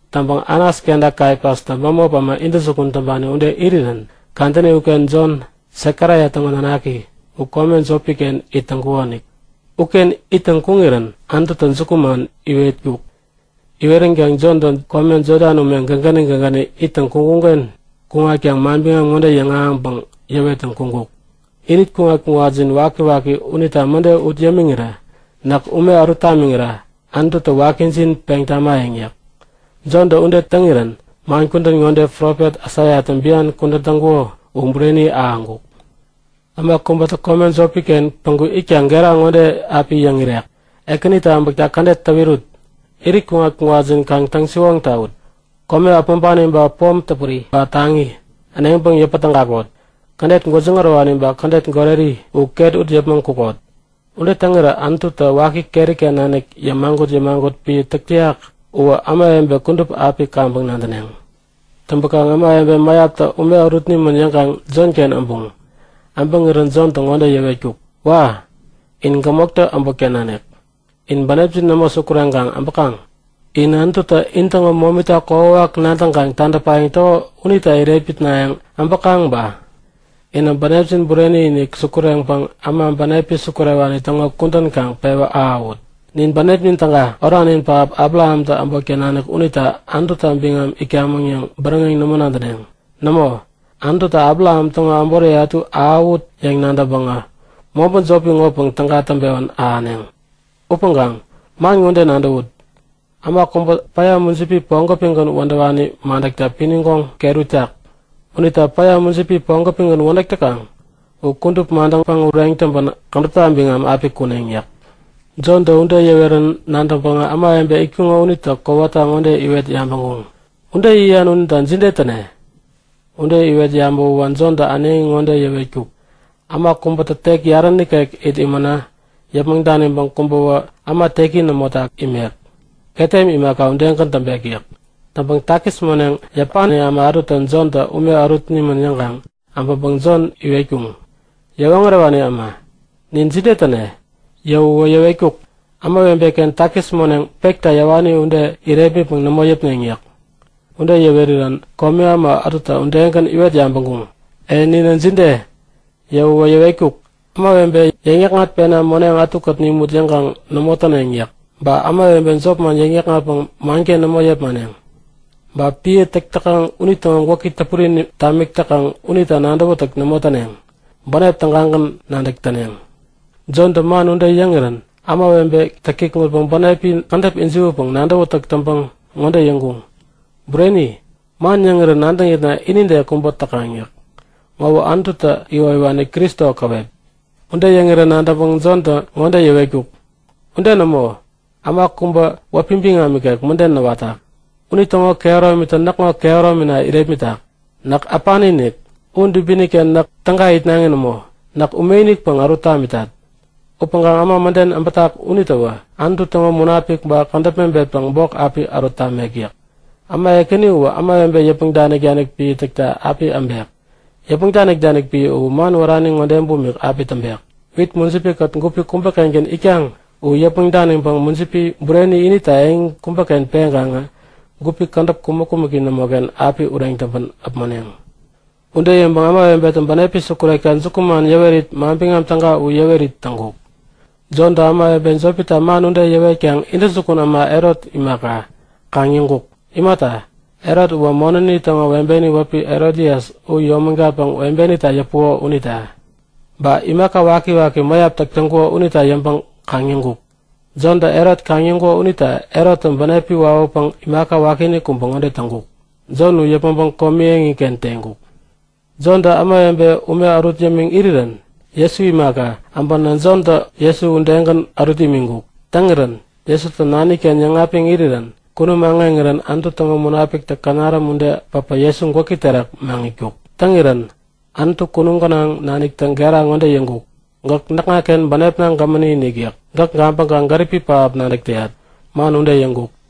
Täŋpäŋ Anas kenta Kaifastä bämop äma intäjukun täŋpani ude irirän kadäni uken Jon, Sekaraia täŋo nanaki u kome jopi-ken it täŋkukonik. Uken ittäŋ kuŋirän Anututä jukuman iwetkuk. Iweränkaŋ Jontä kome Jodan ume gägäni gägäni ittäŋ kuŋkuŋ-ken u kuŋatkaŋ manbiŋam ŋode yäŋahäŋpäŋ yäwettäŋ kuŋkuk; Irit kuŋat-kuŋatjin wakiwaki unita mäde ut yämiŋirä näk ume ärut tamiŋira Anututä wakijin peŋ tamayäŋ yäk. Jontä ude täŋirän man kudän ŋode, profet Aisaiatä bian kudän täŋkuko u bureni ahäŋkuk; Äma kubätä kome jopi-ken päŋku itkaŋ gera ŋode api yäŋ irek; Ekänitä äbäkta kädet täwirut! Irit kuŋat-kuŋatjin kaŋ täŋ-siwoŋ tawut! Kome äpmoŋpani ba pom täpuri ba taŋi äneŋpäŋ yäpä tägakot. Kädet gwäjiŋ ärowani ba kädet goreri u ket ut yäpmäŋ kukot! Ude täŋirä Anututä waki keri-ken nanik yämagut-yämagut piä täk täyak uwä ämawebe kudup api kaŋpäŋ nadäneŋ. Täŋpäkaŋ ämawebe mäyaptä ume ärut nimän yäŋkaŋ Jonken äbuŋ. Äbäŋirä Jontä ŋode yäwetkuk; Wa! In gämoktä äbotken nanik yäk. In bänepjin nämo sukureŋkaŋ äbäkaŋ? In Anututä intäŋo momita kokwawak nadäŋkaŋ tadäpayäŋ täko unita irepmitnayäŋ äbäkaŋ ba? Inä bänepjin bureni-inik sukureŋpäŋ äma bänepi sukurewani täŋo kudän kaŋ pewä ahäwut! Nin bänepnin täga, oranin pähap Abrahamtä äbotken nanik unita Anututa biŋam itkamäŋ yäŋ bäräŋeŋ nämo nadäneŋ. Nämo, Anututä Abraham täŋo äboriye ätu ahäwut yäŋ nadäŋpäŋä mobä jopi ŋopäŋ täga täŋpewän ahäneŋ! Upäŋkaŋ man ŋode nadäwut; Äma kubä päya mujipi pogopigän wädäwani madäkta pinigoŋ ket uritak. Unitä päya, mujipi pogopigän wädäk täkaŋ u kudup madäŋpäŋ ureŋ täŋpän kädäpta biŋam api kuneŋ yäk. Jontä ude yäwerän nadäŋpäŋä ämawebe itkuŋo unitä kowata ŋode iwet yabäŋkuŋ; Ude yäyan unita jide täne? Ude iwet yabäwä Jontä äneŋi ŋode yäwetkuk; Äma kubätä tek yarä nikek it imänä yäpmäŋ daniŋpäŋ kubäwä äma teki nämota imek. Ketem imaka udegän täŋpek yäk. Täŋpäŋ takis moneŋ yäpani äma ätutä Jontä ume ärut nimän yäŋkaŋ äbäŋpäŋ Jon iwetkuŋ; Yäwoŋärewani äma, nin jide täne? Yäwäwä yäwetkuk; Ämawebe-ken takis moneŋ pekta yäwani ude u irepmitpäŋ nämo yäpneŋ yäk. Ude yäwerirän komi äma ätutä udegän iwet yabäŋkuŋ; E ninä jide? Yäwäwä yäwetkuk; Ämawebe täŋyäkŋatpena moneŋ ätukät nimut yäŋkaŋ nämo täneŋ yäk. Ba ämawebe jopman yäŋ-yäkŋatpäŋ manken nämo yepmaneŋ. Ba piä täk täkaŋ unitäŋo gwäki täpuri tamik täkaŋ unita nadäwätäk nämo täneŋ. Bänep tägagän nadäk täneŋ. Jontä man ude yäŋirän ämawebetä kikŋutpäŋ bänepi kädäp jiwäpäŋ nadäwätäk täŋpäŋ ŋode yäŋkuŋ; Bureni! Man yäŋirän nadäŋitna inide kubä täkaŋ yäk. Ŋowä Anutu täŋo iwoyäwani Kristo käwep? Ude yäŋirä nadäŋpäŋ Jontä ŋode yäwetkuk; Ude nämo! Äma kubä wäpi biŋam ikek mäden näwatak. Unitäŋo kehärominitä näkŋo kehäromina irepmitak. Näk äpani-inik. U dubini-ken näk täga itnaŋi nämo. Näk ume-inikpäŋ ärut tamitat. Upäŋkaŋ äma mäden äbätak unitäwä Anutu täŋo Munapik ba kädäp mebetpäŋ bok api ärut tamek yäk. Äma ekäni uwä ämawebe yäpmäŋ danik piä täkta api äbek. Yäpmäŋ danik piä u man wärani ŋode bumik api täŋpek; Wit mujipi-kät gupi kubä-kengän itkaŋ u yäpmäŋ daniŋpäŋ mujipi bureni inita eŋi kubäken peŋkaŋä gupi kädäp kumäk-kumäki nämoken api ureŋ täŋpän äpmoneŋ. Ude yäŋpäŋ ämawebetä bänepi sukurekta jukuman yäwerit Manbiŋam Täga u yäwet täŋkuk. Jontä ämawebe jopita man ude yäwetkaŋ intäjukun äma Herot imaka, kaŋ-yäŋkuk. Imata, Herot uwä monäni täŋo webeni wäpi Herodias u yomägatpäŋ webenita yäpuko unita. Ba imaka wakiwaki mäyap täk täŋkuko unita yäŋpäŋ kaŋ-yäŋkuk. Jontä Herot kaŋ-yäŋkuko unita Herottä bänepi wawäpäŋ imaka wakiinik kubä ŋode täŋkuk; Jon u yäpmäŋpäŋ komi eŋiken teŋkuk. Jontä ämawebe ume ärut yämiŋ irirän Jesu imaka, äbänä Jontä Jesu udegän ärut imiŋkuk. Täŋirän Jesutä Nani-ken yäŋapiŋ irirän kunum aŋeŋirän Anutu täŋo Munapiktä känaräm ude päpä Jesu gwäki terak maŋitkuk. Täŋirän Anutu kunum gänaŋ naniktä gera ŋode yäŋkuk; Gäk näkŋaken bänepna gämäni-inik yäk. Gäk gabäŋkaŋ gäripi pähap nadäk täyat. Man ude yäŋkuk.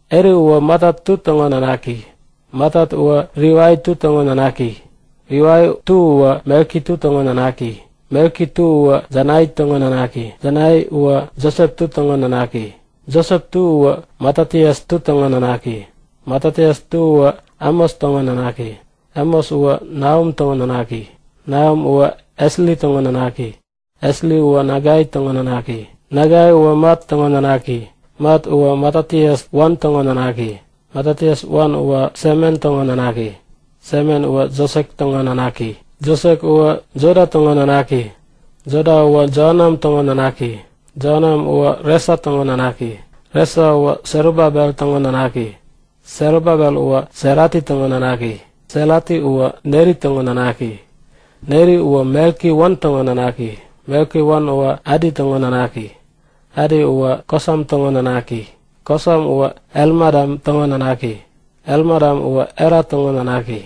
Heli uwä Matat-2 täŋo nanaki. Matat-2 uwä Livai-2 täŋo nanaki. Livai-2 uwä Melki-2 täŋo nanaki. Melki-2 uwä Janai täŋo nanaki. Janai uwä Josep-2 täŋo nanaki. Josep-2 uwä Matatias-2 täŋo nanaki. Matatias-2 uwä Amos täŋo nanaki. Amos uwä Nahum täŋo nanaki. Nahum uwä Esli täŋo nanaki. Esli uwä Nagai täŋo nanaki. Nagai uwä Mat täŋo nanaki. Mat uwä Matatias-1 täŋo nanaki. Matatias-1 uwä Semen täŋo nanaki. Semen uwä Josek täŋo nanaki. Josek uwä Joda täŋo nanaki. Joda uwä Joanan täŋo nanaki. Joanan uwä Resa täŋo nanaki. Resa uwä Serubabel täŋo nanaki. Serubabel uwä Serati täŋo nanaki. Serati uwä Neri täŋo nanaki. Neri uwä Melki-1 täŋo nanaki. Melki-1 uwä Adi täŋo nanaki. Adi uwä Kosam täŋo nanaki. Kosam uwä Elmadam täŋo nanaki. Elmadam uwä Era täŋo nanaki.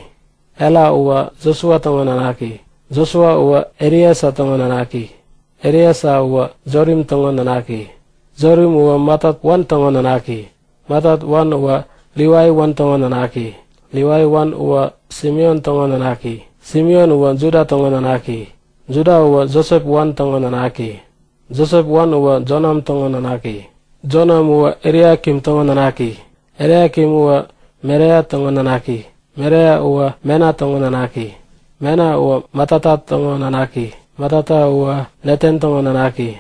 Era uwä Josua täŋo nanaki. Josua uwä Eliesa täŋo nanaki. Eliesa uwä Jorim täŋo nanaki. Jorim uwä Matat-1 täŋo nanaki. Matat-1 uwä Livai-1 täŋo nanaki. Livai-1 uwä Simeon täŋo nanaki. Simeon uwä Juda täŋo nanaki. Juda uwä Josep-1 täŋo nanaki. Josep-1 uwä Jonam täŋo nanaki. Jonam uwä Eliakim täŋo nanaki. Eliakim uwä Melea täŋo nanaki. Melea uwä Mena täŋo nanaki. Mena uwä Matata täŋo nanaki. Matata uwä Natan täŋo nanaki.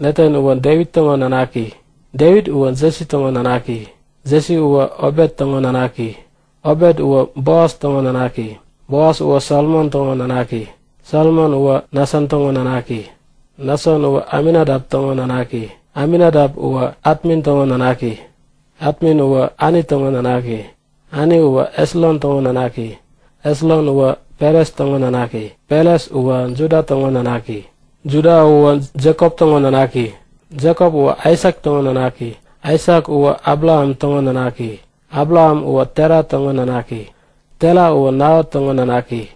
Natan uwä Devit täŋo nanaki. Devit uwä Jesi täŋo nanaki. Jesi uwä Obet täŋo nanaki. Obet uwä Boas täŋo nanaki. Boas uwä Salmon täŋo nanaki. Salmon uwä Nason täŋo nanaki. Nason uwä Aminadap täŋo nanaki. Aminadap uwä Atmin täŋo nanaki. Atmin uwä Ani täŋo nanaki. Ani uwä Esron täŋo nanaki. Esron uwä Peres täŋo nanaki. Peres uwä Juda täŋo nanaki. Juda uwä Jekop täŋo nanaki. Jekop uwä Aisak täŋo nanaki. Aisak uwä Abraham täŋo nanaki. Abraham uwä Tera täŋo nanaki. Tera uwä Naho täŋo nanaki.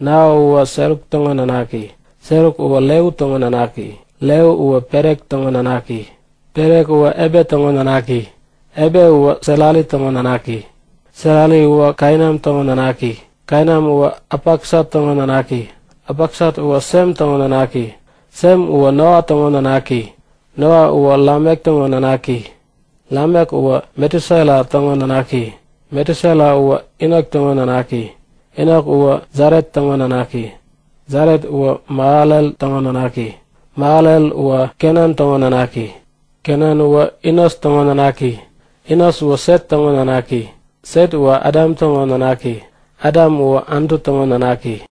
Naho uwä Seruk täŋo nanaki. Seruk uwä Reu täŋo nanaki. Reu uwä Pelek täŋo nanaki. Pelek uwä Ebe täŋo nanaki. Ebe uwä Serari täŋo nanaki. Serari uwä Kainan täŋo nanaki. Kainan uwä Apaksat täŋo nanaki. Apaksat uwä Sem täŋo nanaki. Sem uwä Noa täŋo nanaki. Noa uwä Lamek täŋo nanaki. Lamek uwä Metusela täŋo nanaki. Metusela uwä Enok täŋo nanaki. Enok uwä Jaret täŋo nanaki. Jaret uwä Mahalel täŋo nanaki. Mahalel uwä Kenan täŋo nanaki. Kenan uwä Enos täŋo nanaki. Enos uwä Set täŋo nanaki. Set uwä Adam täŋo nanaki. Adam uwä Anutu täŋo nanaki.